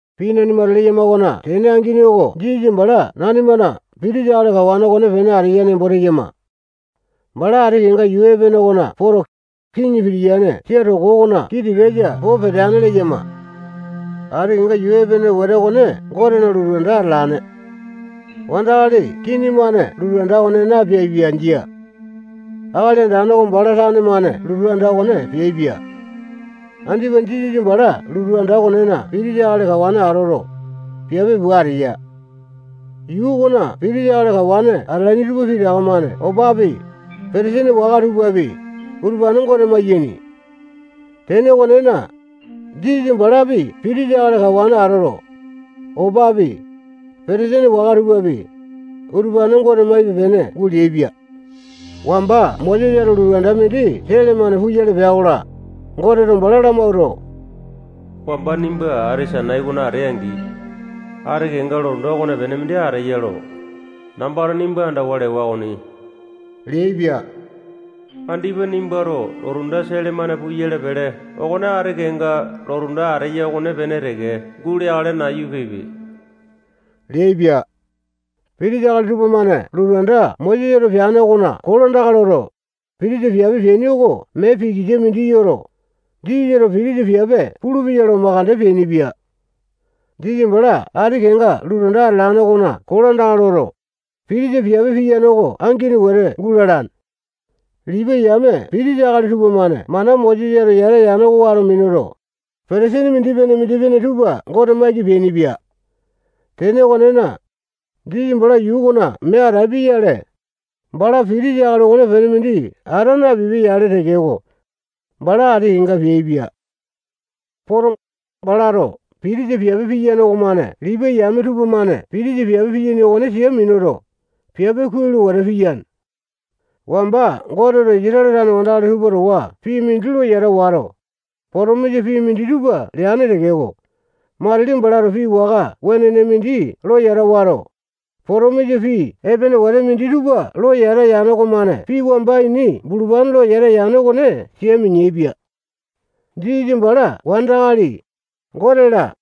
Pii nanimato leyama okona tene angini oko Jisasa bala nanimana pitisa akali kawane okonepene ateya nembo teyama. Bala ati kenga yuu epene okona poto, kiŋi pitiyane sia toko okona kii tikasa po peteane leyama. Ati kenga yuu epene wete okone Gotena lotu anda atalane. Wandakali kini-mane lotu anda okone napeaipia. Jia. Akali Andane oko bala tane-mane lotu anda okone peaipia. Andipa Jisasa bala lotu anda okonena pitisa akali kawane atoto, piape pua ateya. Yuu okona pitisa akali kawane atalaini tupa pitaka-mane opapi, petesene waka tupapi, utupane Gote mayaini. Tene okonena, Jisasa balapi pitisa akali kawane atoto, opapi, petesene waka tupapi, utupane Gote maipe-pene guleaipia. Wamba Mosesato lotu anda mindi sele-mane puyale pea-kola, Goteto bala lamawuato, wamba nimba ati Sainai okona atee-angi, ati kenga lotu anda okopene mindi ateya lo, nambato nimba andawa lewa okoni leaipia. Andipa nimbato lotu anda sele-mane puyale pele okone ati kenga lotu anda ateya okonepene teke guleakale nayu pipe leaipia. Pitisa akali tupamane lotu anda Mosesato peane okona kolandaka loto, pitisa piape peaini oko mee pikisa mindi yoto, Jisasato pitisa piape pulupeya lo makande peainipia. Jisasa bala ati kenga lotu anda atalane okona kolandaka loto, pitisa piape piyane oko angini wete gulalane. Lipai yame pitisa akali tupamane mana Mosesato yata yane oko wato minuto, petesini mindipene-mindipene tupa Gote maiki peainipia. Tene okonena, Jisasa bala yuu okona mee atapia-yale, bala pitisa akali okonepene mindi ata napipia-yale tekeko, bala ati kenga peaipia. Poto, balato pitisa piape piyane okomane Lipai yame tupamane pitisa piape piyaini okone sia minuto, piape kuai lo wete piyane. Wamba Goteto Isatale tane wandakali tupa towa pii mindi lo yata wato, potomisa pii minditupa leane tekeko, matili balato pii waka wenene mindi lo yata wato, potomisa pii epene wete minditupa lo yata yane okomane pii wamba ini bulupane lo yata yane okone sia mineaipia. Jisasa bala wandakali, Gote-la,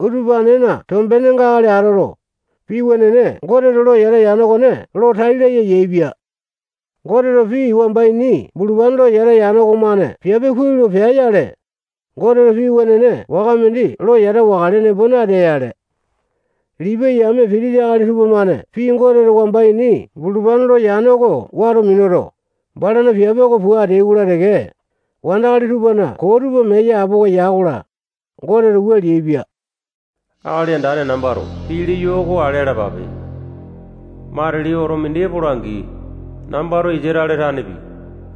utupanena tombenenga akali atoto, pii wenene Goteto lo yata yane okone lo tai laya yaepia. Goteto pii wamba ini bulupane lo yata yane okomane piape kuai lo pea-yale, Goteto pii wenene waka mindi lo yata wakale nembo natea-yale. Lipai yame pitisa akali tupamane pii Goteto wamba ini bulupane lo yane oko wato minuto, balana piape oko pua ateai-kola teke, wandakali tupana koo tupa mee yapowa ya-kola, Goteto wua leaipia: Akali Andane nambato pii leyo oko ale alapape. Matili oto mindi epola-angi, nambato Isatale tanepi,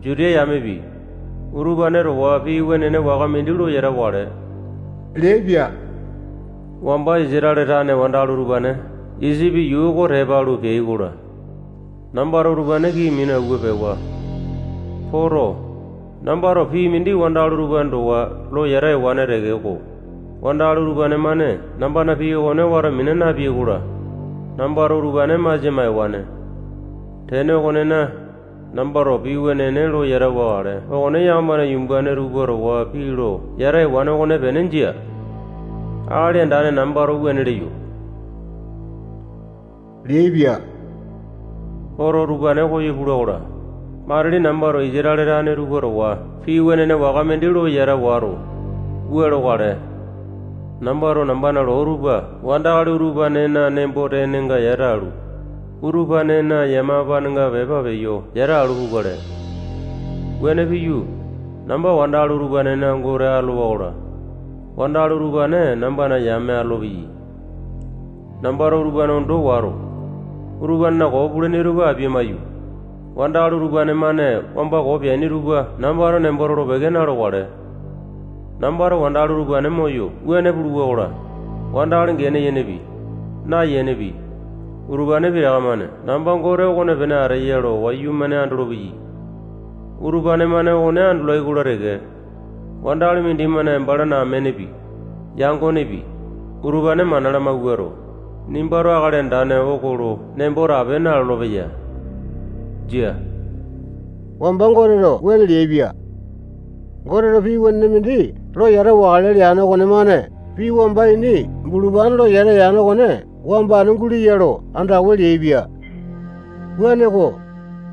Juta yamepi, utupane towa pii wenene waka mindi lo yata wakale leaipia. Wamba Isatale tane wandakali utupane Isipi yuu oko tepa alu peai-kola, nambato utupane kii minu awua pewa. Poto, nambato pii mindi wandakali utupane towa lo yata ewane tekeko, wandakali utupane-mane nambana pii okone wato mina napeai-kola, nambato utupane masia maewane. Tene okonena, nambato pii wenene lo yata wakale okone wamba yakamana yumbane tupa towa pii lo yata ewane okonepene jia. Akali Andane nambato wuane leyo, leaipia. Oto utupane koyo pula-kola, matili nambato Isatale tane tupa towa pii wenene waka mindi lo yata wato, wua lokale: Nambato nambana loo tupa wandakali utupanena nembo-tenenga yata alu, utupanena yamapanenga pepa peyo yata alu pukale. Wuane piyu, namba wandakali utupanena Gote atolowa-kola, wandakali utupane nambana yame atolopeyai. Nambato utupane ondo wato, utupanena koo pulaini tupa apia-maiyu, wandakali utupane-mane wamba koo peaini tupa nambato nembo tolo-peke na-lokale. Nambato wandakali utupane moyo wuane puluwa-kola, wandakali gene yenepi, nayenepi, utupane pitaka-mane namba Gote okopene ateya lo wayumane andolopeyai. Utupane-mane okone andolai-kola teke, wandakali mindimane balana amenepi, yangonepi, utupane mana lamawuato, nimbato Akali Andane oko lo nembo tape nalolo-peya. Jia. Wamba Goteto wuane leaipia. Goteto pii wenene mindi lo yata wakale leane okonemane pii wamba ini bulupane lo yata yane okone wambane guleya lo andawa leaipia. Wuaneko,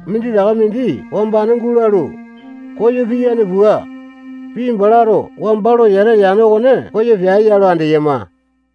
minditaka mindi wambane gulalu, koyo piyane pua, pii balato wamba lo yata yane okone koyo peae-ya lo andeyama.